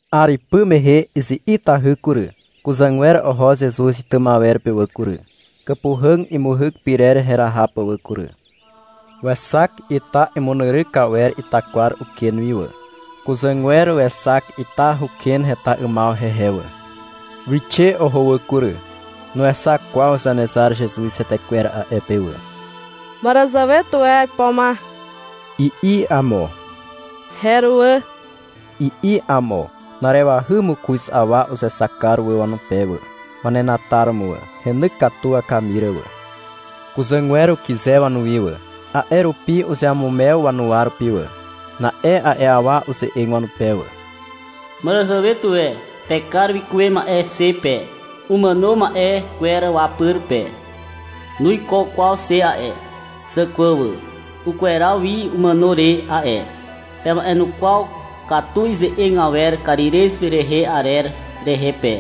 'Ar ipy mehe izi'itahy kury, kuzàgwer oho Zezuz itym awer pe wà kury, kàpuhàg imuhyk pyrer heraha pà wà kury. Wexak ita imunyryk awer itakwar uken wi wà. Kuzàgwer wexak ita huken heta 'ymaw hehe wà. Wixe oho wà kury. Nuexak kwaw Zanezar Zezuz hetekwer a'e pe wà. — Màràzàwe tuwe aipo ma, i'i amo. — Heruwà, i'i amo. Na'arewahy mokoz awa uzexak kar wà wanupe wà, wanenataromo wà. Heny katu wakamir wà. Kuzàgwer ukyze wanuwi wà. A'e rupi uzeamumew wanuwa rupi wà. Na'e a'e awa uze'eg wanupe wà. — Màràzàwe tuwe pekar wikuwe ma'e xe pe, umàno ma'e kwer wapyr pe. Nuiko kwaw xe a'e, zàkwà wà. Ukweraw wi umàno re a'e. Pema'enukwaw katu ize'eg awer Karirez rehe arer rehe pe.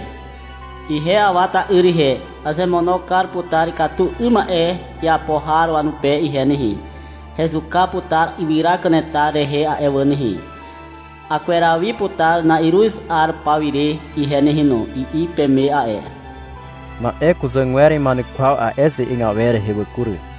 — Ihe Awa ta'yr ihe, azemono kar putar ikatu 'ym ma'e iapo har wanupe ihe nehe. Hezuka putar ywyra kanetar rehe a'e wà nehe. Akweraw wi putar na'iruz 'ar pawire ihe nehe no, i'i peme a'e. Na'e kuzàgwer ima'enukwaw a'e ize'eg awer rehe wà kury.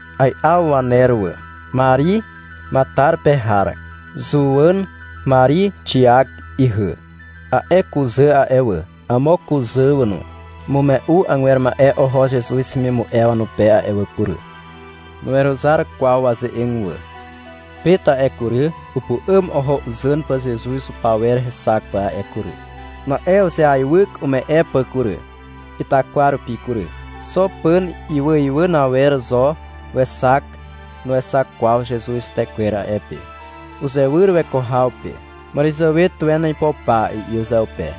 Ai'aw waner wà. Mari Matar pe har, Zuwàn, Mari Xiak ihy. A'e kuzà a'e wà, amo kuzà wà no, umume'u agwer ma'e oho Zezuz hemimu'e wanupe a'e wà kury. Nuweruzar kwaw waze'eg wà. Pet a'e kury, upu'àm oho uzàn pà Zezuz hupawer hexak pà a'e kury. Na'e uzeaiwyk ume'e pà kury, itakwar rupi kury. Xo pàn iwàiwàn awer zo wexak, nuexak kwaw Zezuz hetekwer a'e pe. Uzewyr weko haw pe. — Màràzàwe tuwen aipo pa, i'i uzeupe.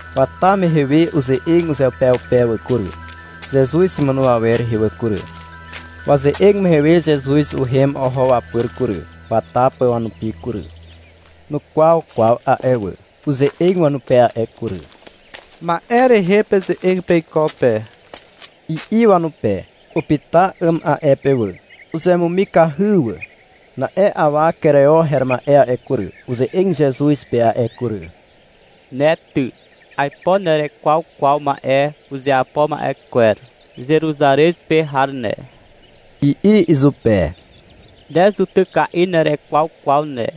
Wata mehe we, uze'eg uzeupeupe wà kury, Zezuz imàno awer rehe wà kury. Waze'eg mehe we Zezuz uhem oho wapyr kury, wata pà wanupi kury. Nukwaw kwaw a'e wà. Uze'eg wanupe a'e kury. — Ma'e rehe peze'eg peiko pe, i'i wanupe. Upyta 'àm a'e pe wà. Uzemumikahy wà. Na'e awa Kereo her ma'e a'e kury, uze'eg Zezuz pe a'e kury. — Ne ty, aipo nerekwaw kwaw ma'e uzeapo ma'e kwer, Zeruzarez pe har ne, i'i izupe. Ne zutyka'i nerekwaw kwaw ne.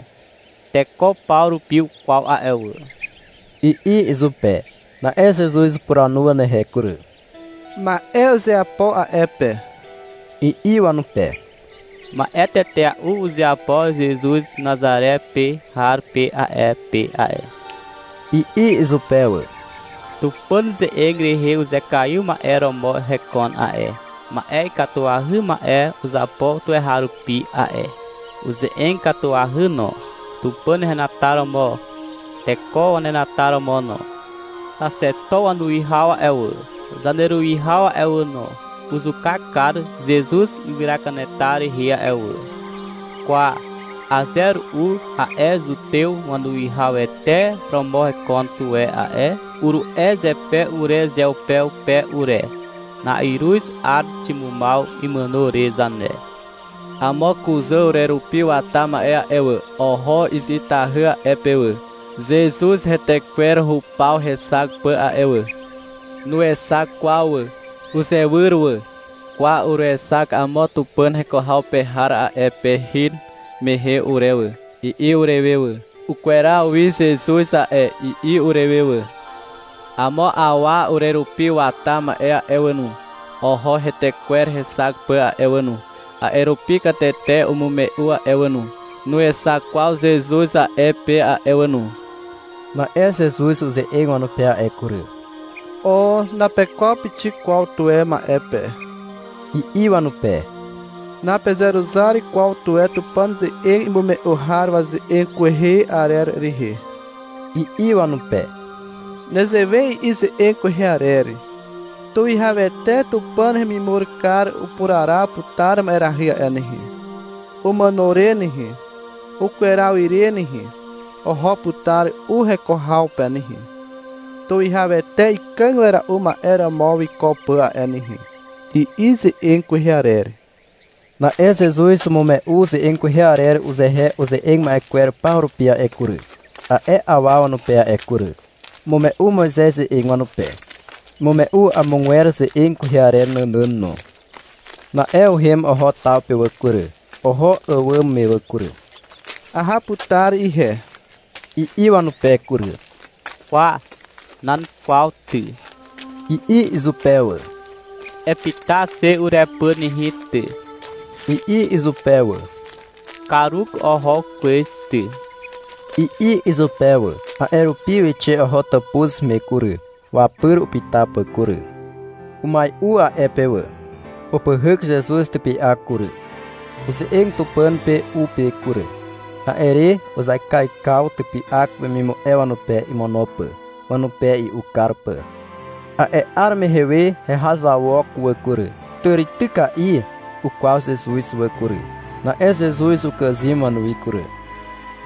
Teko paw rupi ukwaw a'e wà, i'i izupe. Na'e Zezuz upuranu wanehe kury. — Ma'e uzeapo a'e pe, i'i wanupe. — Ma'e tetea'u uzeapo Zezuz Nazare pe har pe a'e pe a'e, i'i izupe wà. Tupàn ze'eg rehe uzekaiw ma'e romo hekon a'e, ma'e ikatuahy ma'e uzapo tuweharupi a'e. Uze'eg katuahy no, Tupàn henataromo, teko wanenataromo no. Xaxeto wanuwihaw a'e wà, zaneruwihaw a'e wà no, uzuka kar Zezuz ywyra kanetar rehe a'e wà. Kwa, aze ru'u a'e Zutew wanuwihawete romo hekon tuwe a'e, uru'e zepe urezeupeupe ure. Na'iruz 'ar ximumaw imàno re zane. Amo kuzà urerupi wata ma'e a'e wà, oho izi'itahy a'e pe wà, Zezuz hetekwer hupaw hexak pà a'e wà. Nuexak kwaw wà. Uzewyr wà. Kwa, uruexak amo Tupàn heko haw pe har a'e pe hin mehe ure wà, i'i urewe wà. Ukweraw wi Zezuz a'e, i'i urewe wà. Amo awa urerupi wata ma'e a'e wà no, oho hetekwer hexak pà a'e wà no. A'e rupi katete umume'u a'e wà no, nuexak kwaw Zezuz a'e pe a'e wà no. Na'e Zezuz uze'eg wanupe a'e kury. — O, napekwaw pixik kwaw tuwe ma'e pe, i'i wanupe. — Napezeruzar kwaw tuwe Tupàn ze'eg imume'u har waze'eg kwehe arer rehe, i'i wanupe. Nezewe i'i ze'eg kwehe arer. — Tuwihawete Tupàn hemimur kar upuraraw putar ma'erahy a'e nehe. Umàno re nehe, ukweraw ire nehe, oho putar u heko haw pe nehe, Tuwihawete ikàg wera'u ma'e romo wiko pà a'e nehe, i'i ze'eg kwehe arer. Na'e Zezuz umume'u ze'eg kwehe arer uzehe uze'eg ma'e kwer paw rupi a'e kury, a'e awa wanupe a'e kury. Umume'u Moizez ze'eg wanupe. Umume'u amogwer ze'eg kwehe arer nànàn no. Na'e uhem oho taw pe wà kury, oho àwàm me wà kury. -Aha putar ihe, i'i wanupe kury. — Kwa, nan kwaw ty, i'i izupe wà. — Epyta xe urepyr nehe ty, i'i izupe wà. — Karuk oho kwez ty, i'i izupe wà. A'e rupi wixe oho tàpuz me kury, wapyr upyta pà kury. Umai'u a'e pe wà. Upyhyk Zezuz typy'ak kury. Uze'eg Tupàn pe u pe kury. A'e re uzaikaikaw typy'ak wemimu'e wanupe imono pà, wanupe i'u kar pà. A'e 'ar mehe we hehazawok wà kury. Tàrityka'i ukwaw Zezuz wà kury. Na'e Zezuz ukàzym wanuwi kury.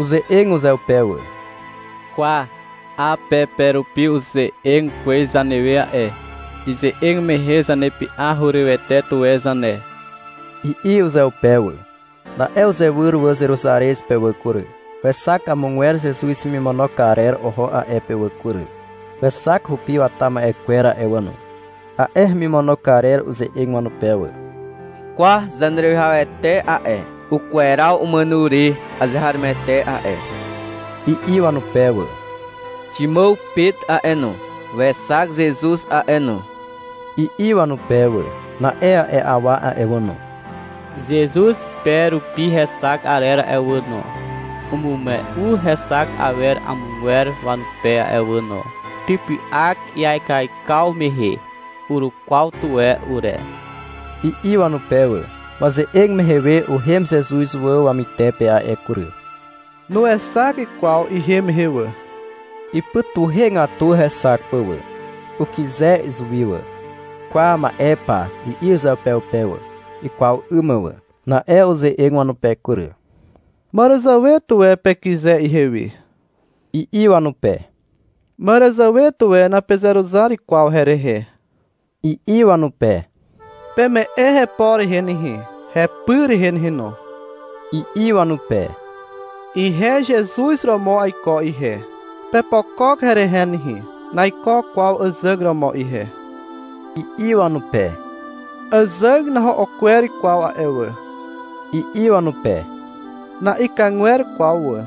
Uze'eg uzeupe wà. — Kwa, 'a pe pe rupi uze'eg kwez zanewe a'e. Ize'eg mehe zanepy'a hurywete tuwe zane, i'i uzeupe wà. Na'e uzewyr wà Zeruzarez pe wà kury. Wexak amogwer Zezuz hemimono karer oho a'e pe wà kury, wexak hupi wata ma'e kwer a'e wà no. A'e hemimono karer uze'eg wanupe wà. — Kwa, Zaneruwihawete a'e, ukweraw umàno re azeharomoete a'e, i'i wanupe wà. — Ximàw Pet a'e no, wexak Zezuz a'e no, i'i wanupe wà. Na'e a'e awa a'e wà no, Zezuz pe rupi hexak arer a'e wà no, umume'u hexak awer amogwer wanupe a'e wà no. — Typy'ak iaikaikaw mehe, urukwaw tuwe ure, i'i wanupe wà. Waze'eg mehe we uhem Zezuz wà wamytepe a'e kury. Nuexak kwaw ihem mehe wà. Ipytuhegatu hexak pà wà. Ukyze izuwi wà. — Kwa, ma'e pa, i'i uzeupeupe wà, ikwaw 'ym mà wà. Na'e uze'eg wanupe kury. — Màràzàwe tuwe pekyze ihewi, i'i wanupe. — Màràzàwe tuwe napezeruzar kwaw herehe, i'i wanupe. — Peme'e hepo rehe nehe, hepy rehe nehe no, i'i wanupe. — Ihe Zezuz romo aiko ihe, pepokok herehe nehe. Naiko kwaw àzàg romo ihe, i'i wanupe. — Àzàg naho'o kwer kwaw a'e wà, i'i wanupe. — Na'ikagwer kwaw wà,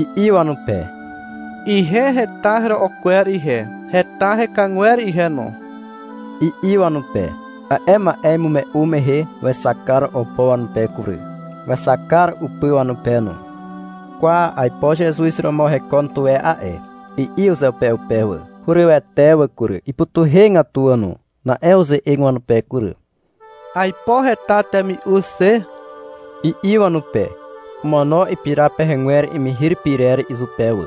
i'i wanupe. — Ihe heta hero'o kwer ihe, heta hekàgwer ihe no, i'i wanupe. A'e ma'e imume'u mehe wexak kar opo wanupe kury, wexak kar upy wanupe no. — Kwa, aipo Zezuz romo hekon tuwe a'e, i'i uzeupeupe wà. Hurywete wà kury. Ipytuhegatu wà no. Na'e uze'eg wanupe kury. — Aipo heta temi'u xe, i'i wanupe. Omono ipira pehegwer imihir pyrer izupe wà.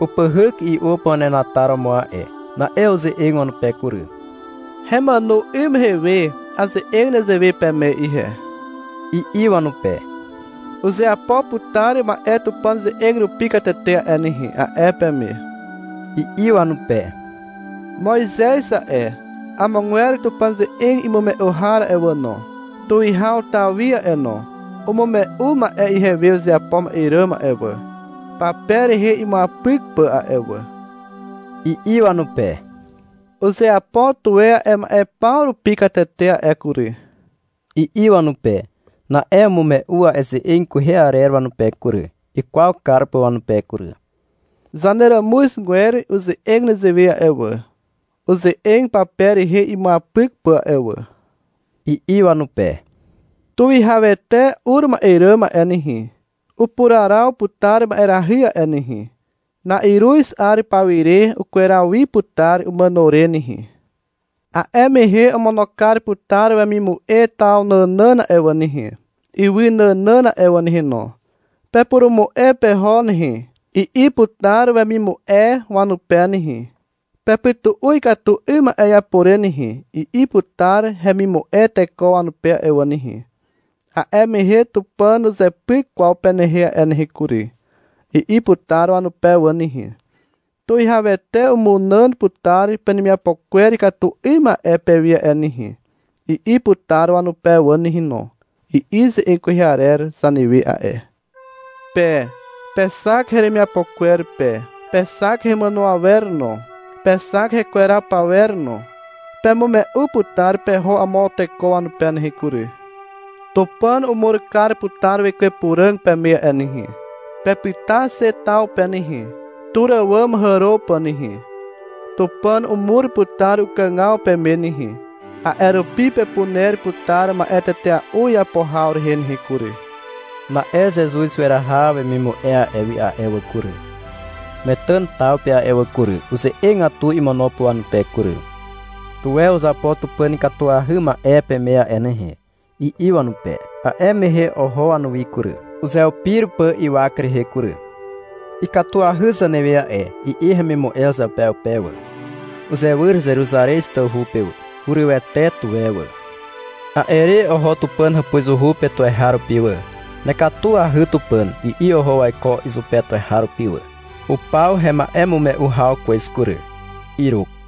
Upyhyk i'u pà wanenataromo a'e. Na'e uze'eg wanupe kury. — Hemàno 'ym mehe we aze'eg nezewe peme ihe, i'i wanupe. — Uzeapo putar ma'e Tupàn ze'eg rupi katete a'e nehe, a'e peme, i'i wanupe. — Moizez a'e, amogwer Tupàn ze'eg imume'u har a'e wà no, Tuwihaw Tawi a'e no, umume'u ma'e ihewe uzeapo ma'e ràm a'e wà, pape rehe imuapyk pà a'e wà, i'i wanupe. — Uzeapo tuwe a'e ma'e paw rupi katete a'e kury, i'i wanupe. Na'e umume'u a'e ze'eg kwehe arer wanupe kury, ikwaw kar pà wanupe kury. — Zaneràmuzgwer uze'eg nezewe a'e wà, uze'eg pape rehe imuapyk pà a'e wà, i'i wanupe. — Tuwihawete ur ma'e ràm a'e nehe, upuraraw putar ma'erahy a'e nehe. Na'iruz 'ar pawire ukweraw wi putar umàno re nehe. A'e mehe omono kar putar wemimu'e taw nànàn a'e wà nehe, ywy nànàn a'e wà nehe no. Pepurumu'e peho nehe, i'i putar wemimu'e wanupe nehe. — Pepytu'u ikatu 'ym ma'e iapo re nehe, i'i putar hemimu'e teko wanupe a'e wà nehe. — A'e mehe Tupàn nuzepyk kwaw penehe a'e nehe kury, i'i putar wanupe wà nehe. — Tuwihawete umunàn putar penemiapo kwer ikatu 'ym ma'e pewi a'e nehe, i'i putar wanupe wà nehe no, i'i ze'eg kwehe arer zanewe a'e. Pe pexak heremiapo kwer pe, pexak hemàno awer no, pexak hekweraw pawer no. Pemume'u putar peho amo teko wanupe nehe kury. Tupàn umur kar putar Wekwe Puràg peme a'e nehe. Pepyta xe taw pe nehe, tur àwàm hàro pà nehe. Tupàn umur putar ukàgaw peme nehe, a'e rupi pepuner putar ma'e tetea'u iapo haw rehe nehe kury. Na'e Zezuz weraha wemimu'e a'e wi a'e wà kury, Metàn taw pe a'e wà kury, uze'egatu imono pà wanupe kury. Tuwe uzapo Tupàn ikatuahy ma'e peme a'e nehe, i'i wanupe. A'e mehe oho wanuwi kury, uzeupir pà ywak rehe kury. — Ikatuahy zanewe a'e, i'i hemimu'e uzeupeupe wà. Uzewyr Zeruzarez tawhu pe wà. Hurywete tuwe wà. A'e re oho Tupàn hàpuzuhu pe tuweharupi wà. — Nekatuahy, Tupàn, i'i oho waiko izupe tuweharupi wà. Upaw hema'emume'u haw kwez kury. Iruk.